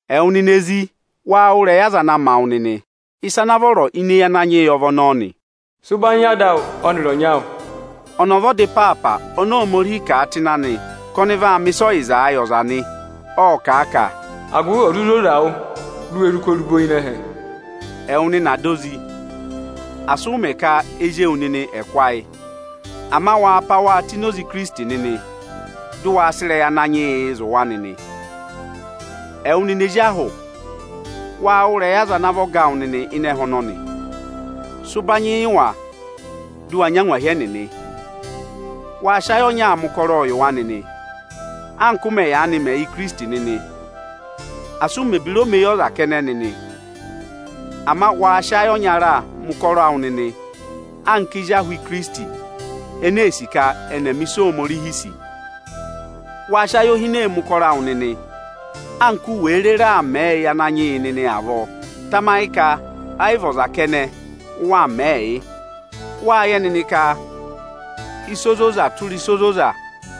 Ẹwụ nịnị ezi, waa wụ́ ịrẹyị aza na ma wụ nịnị! Ịsa ana vọrọ ini eyi Ananyị yị ọ vị ọnọọ nị. “Sị ụbanyị yị ada awụ ọnịrị ọnyị awụ!” Ọnọọ ọ vị ọda ịpaapa oni Ohomorihi kà a tụ́ ịnị anị ka ọnị vaa mẹ̀ ịsa ọyịzaa yị ọza nị. Ọ́ọ kà a ka: “agụvị ò zụ zoza wụ, di u we zụ kú orubo ịnị ẹhẹ.” Ẹwụ nịnị ada ozi, asị ụ mẹ̀ ka ezi ewu nịnị ẹ̀ kụ́ ayị! Ama waa pá waa tụ́ ini oze Ikirisiti nịnị, dị ụ waa sị ịrẹyị Ananyị yịị zụ̀ wa nịnị. Ẹwụ nịnị ezi ahụ, waa wụ́ ịrẹyị aza ana vị ọga awụ nịnị ịnị ẹhẹ ọnọnị! Sị ụbanyị yị wa, dị ụ wa nyị angwahi ẹnịnị! Waa sị ayị ọnyaa mẹ ụkọrọọ yị wa nịnị, anka ụ mẹ̀ yaanị mẹ yị Ikirisiti nịnị! Asị ụ mẹ̀ ebira omeyọza kẹnẹ nịnị, ama waa sị ayị ọnyaa mẹ̀ ụkọrọ awụ nịnị anka ezi ahụ Ikirisiti ene ee sì ka ẹnị ẹ̀ mẹ ịsị Ohomorihi sì! Waa sị ayohinee mẹ̀ ụkọrọ awụ nịnị, anka u wèe rere aa mẹẹ yị Ananyị yị nịnị avọọ. Tamayị ka ẹ yị vị ọza kẹnẹ ụ waa mẹẹ yị nịnị. Wáa yẹ nịnị ka ịsa ozoza tụra ịsa ozoza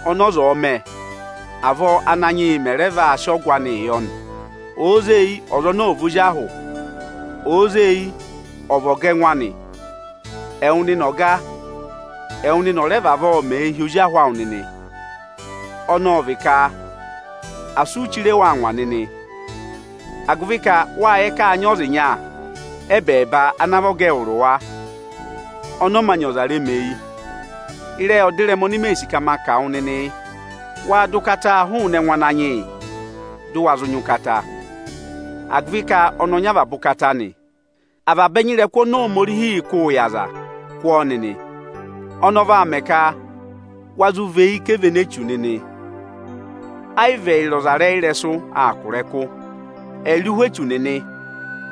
ọnị ọza ọ̀ọ mẹ, avọọ Ánanyị yị mẹ̀ rẹ vaa sị ọgụ anịị yọ nị. Òo zee eyi, ọza ọnọọ ọ̀ vị ozi ahụ, òo zee eyi, ọ̀ vị ọga ẹngụ anị. Ẹwụ nịnị ọga, ẹwụ nịnị ọ̀ rẹ vavọọ mẹẹ hi ozi ahụ awụ nịnị, ọnị ọ vị ka asị u chire wa angwa nịnị, agụvị ka wáa yẹ ka áa nyị ọza ịnya ẹ́bẹẹba ana vị ọga ẹwụrị wa; ọnị ọ mā nyị ọza remeyi. Ịrẹyị ọdịrẹma oni mee sì ka ma kà wụ nịnị, yị: Waa dọ ụkataa hụụnị ẹngụ Ananyị yị dị ụ wa zụ nyị ụkata, agụvị ka ọnị ọ nyị avaba ụkata nị. Avaba ẹnya ịrẹkụ oni Ohomorihiī kụ́ụ yị ọza, kụ́ ọọ nịnị! Ọnọọ vaa mẹ ka wa zụ và eyi kà evene Echu nịnị. Ẹ yị vị ẹyịrị ọzarẹyịrẹsụ aa kụ̀ ịrẹkụ. Ẹyịrị ụhwẹ echu nịnị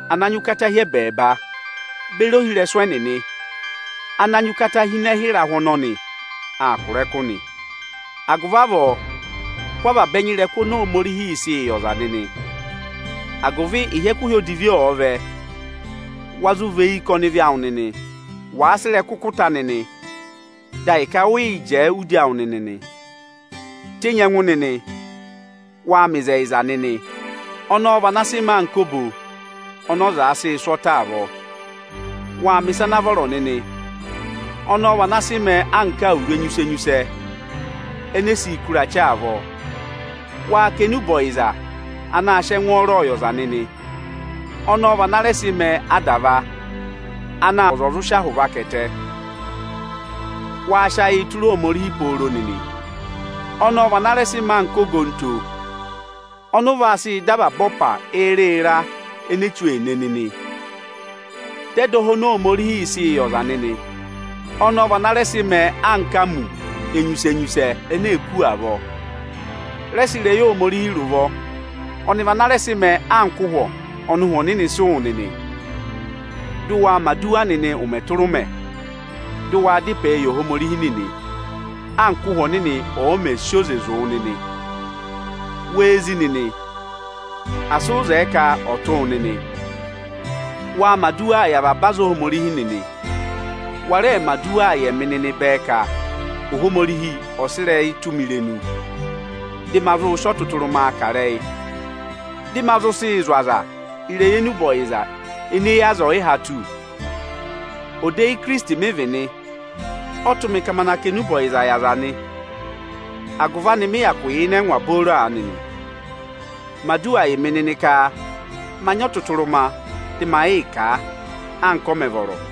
ana nyị ụkata hi ẹbẹẹba beri ohirẹsụ ẹnịnị ana nyị ụkata hi ịnị ẹhẹ ịrahụ ọnọnị aa kụ̀ ịrẹkụ nị. Agụvị avọọ kụ́ avaba ẹnya ịrẹkụ oni Ohomorihiī sịị yị ọza nịnị, agụvị ịhị ẹkụhị odivi ọ̀ọ vẹ, wa zụ và eyi kà ọnịvị awụ nịnị. Wàa sị ịrẹkụ kụ̀ ta nịnị, dị ahịka ụ yị jẹẹ udi awụ nịnị nị. Tenyi ẹngụ nịnị! Waa mẹ ịzẹyịza nịnị! Ọnọọ vị ana sị mẹẹ anka obo ọnị ọza sịị̄ sụ́ ọtẹ avọọ. Waa mẹ̀ ịsa ana vọrọ nịnị! Ọnọọ vị ana sị mẹẹ anka awuru enyusẹ-enyusẹ ene e siī kú ịrachị avọọ. Waa kà enube ọyịza anaā sịị ẹngwọọrọ yị ọza nịnị! Ọnọọ vị ana rẹ sị mẹẹ adava anaā mẹ ka ọza ọ̀ zụ sị ahụ vaka ẹtẹ. Waa sị ayịị tụra Ohomorihi pooro nịnị! Ọnọọ vị ana rẹ sị mẹẹ anka ogonto ọnị ụ vaa sị dọ avaba ọpa ịra-ịra ene Echu ee ne nịnị. Dọ ẹdọha oni Ohomorihiī sịị yị ọza nịnị! Ọnọọ vị ana rẹ sị mẹẹ anka amu enyusẹ-enyusẹ ene eē kú avọọ. Rẹ sị ịrẹyị Ohomorihi rị ụvọ. Ọnị vị ana rẹ sị mẹẹ anka ụhwọ ọnị. Ụhwẹ Ọnịnị sị wụ nịnị. Dị ụ waa mẹ̀ aduwa nịnị ụmẹ tụra ụmẹ, dị ụ waa dá ịpẹẹ yị Ohomorihi nịnị, anka Ụ́hwẹ Ọnịnị ọ̀ọ mẹ̀ sị oze zụ̀ wụ nịnị! Wee zí nịnị, asị ụ zẹẹ ka ọ̀ tụ́ wụ nịnị! Waa mẹ̀ aduwaa yị avaba aza Ohomorihi nịnị. Wa rẹẹ mẹ̀ aduwaa yị ẹmị nịnị bẹẹ ka, Ohomorihi ọ̀ sị ịrẹyị tụ́ mị irenu, dị ma zụụ sị ọtụtụrụma kà ịrẹyị, dị ma zụ sị zụ̀ aza ịrẹyị enube ọyịza ene eyi aza ọ̀yị há tù. Odeyi Ikirisiti mị vị nị, ộ tụ́ mị ka ma naa kà enube ọyịzaa yị aza nị; agụvị anị mị hyakụ yà ịnị ẹngwa booro aanị nị. Mẹ aduwa yị mị nịnị ka ma nyị ọtụtụrụma dị ma yịị kà a, anka ọ mẹ̀ vọrọ!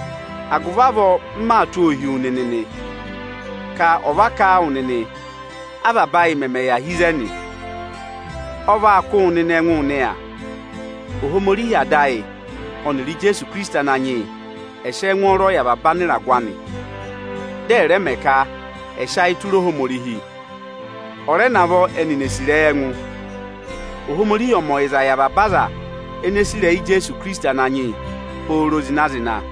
Agụvị avọọ, m maa tụ́ ọọ hi wu nịnị nị, ka ọ̀ va kà a wụ nịnị, avaba ayị mẹmẹ yà hi ịzẹnị. Ọ vaa kụ́ wụ nịnị ẹngụụ nịya. Ohomorihi Ada ayị ọnịrị Ijeesu Ikirisiti Ananyị yị ẹ̀ sị ẹngwọọrọ yị avaba anịragụ anị, dị ẹ̀ rẹ mẹ ka ẹ̀ẹ sị ayịị tụra Ohomorihi; ọ̀ rẹ navọ ẹnịnị èe sì ịrẹyị ẹngụ! Ohomorihi ọ̀ mẹ ọyịza yị avaba aza ene sì ịrẹyị Ijeesu Ikirisiti Ananyị yị pooro zịna-zịna.